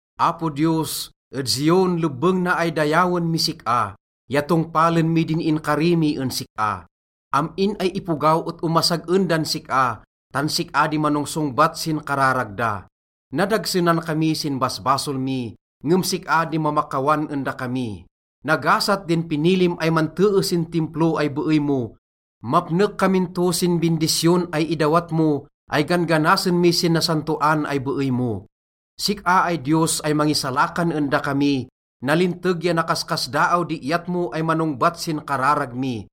Apo Diyos, ed Zion lebbeng na ay dayawen mis sik-a ya tongpalen mi din inkari mi en sik-a, am-in ay ipogaw et omasag-en dan sik-a, tan sik-a di manongsongbat sin kararag da. Nadagsenan kami sin basbasol mi, ngem sik-a di mamakawan en dakami. Nagasat din pinilim ay mantee sin Timplo ay beey mo. Mapnek kamin to sin bindisyon ay idawat mo ay gan-ganasen mi sin nasantoan ay beey mo. Sik-a ay Diyos ay mangisalakan en dakami, nalinteg ya nakaskasdaaw di iyat mo ay manongbat sin kararag mi.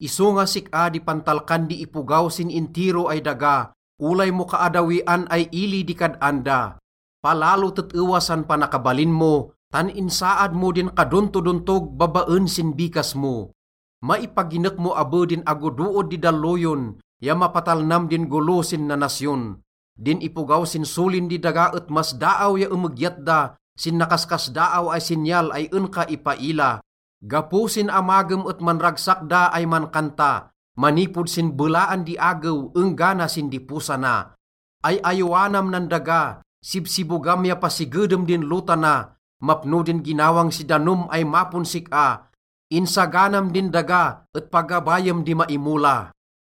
Isonga sik-a di pantalkan di ipogaw sin intiro ay daga, olay mo kaaddawian ay ili di kad-an da. Palalo tet-ewa san panakabalin mo, tan insaad mo din kadontodontog babaen sin bikas mo. Maipaginek mo abe din agodood di dalloyon ya mapatalnam din golo sin nanasyon. Din ipogaw sin solin di daga et masdaaw ya emegyat da sin nakaskasdaaw ay sinyal ay en ka ipaila. Gapo sin amagem et manragsak da ay mankanta, manipod sin belaan di agew enggana sin diposana. Ay-ayowanam nan daga, sibsibogam ya pasigedem din lota na. Mapno din ginawang si danom ay mapon sik-a, insaganam din daga et pagabayem di maimola.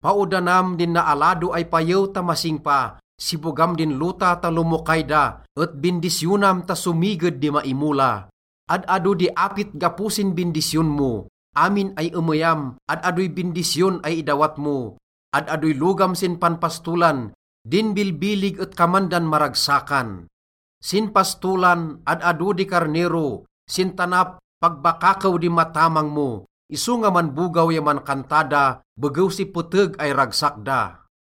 Paodanam din naalado ay payew ta masingpa, sibogam din lota ta lomokay da, et bindisyonam ta somiged di maimola. Ad-ado di apit gapo sin bindisyon mo. Amin ay emeyam, ad-adoy bindisyon ay idawat mo. Ad-adoy logam sin panpastolan, din bilbilig et kaman dan maragsakan. Sin pastolan, ad-ado di karnero, sin tanap, pag bakakew di matamang mo, isonga manbogaw ya mankanta da begew si peteg ay ragsak da.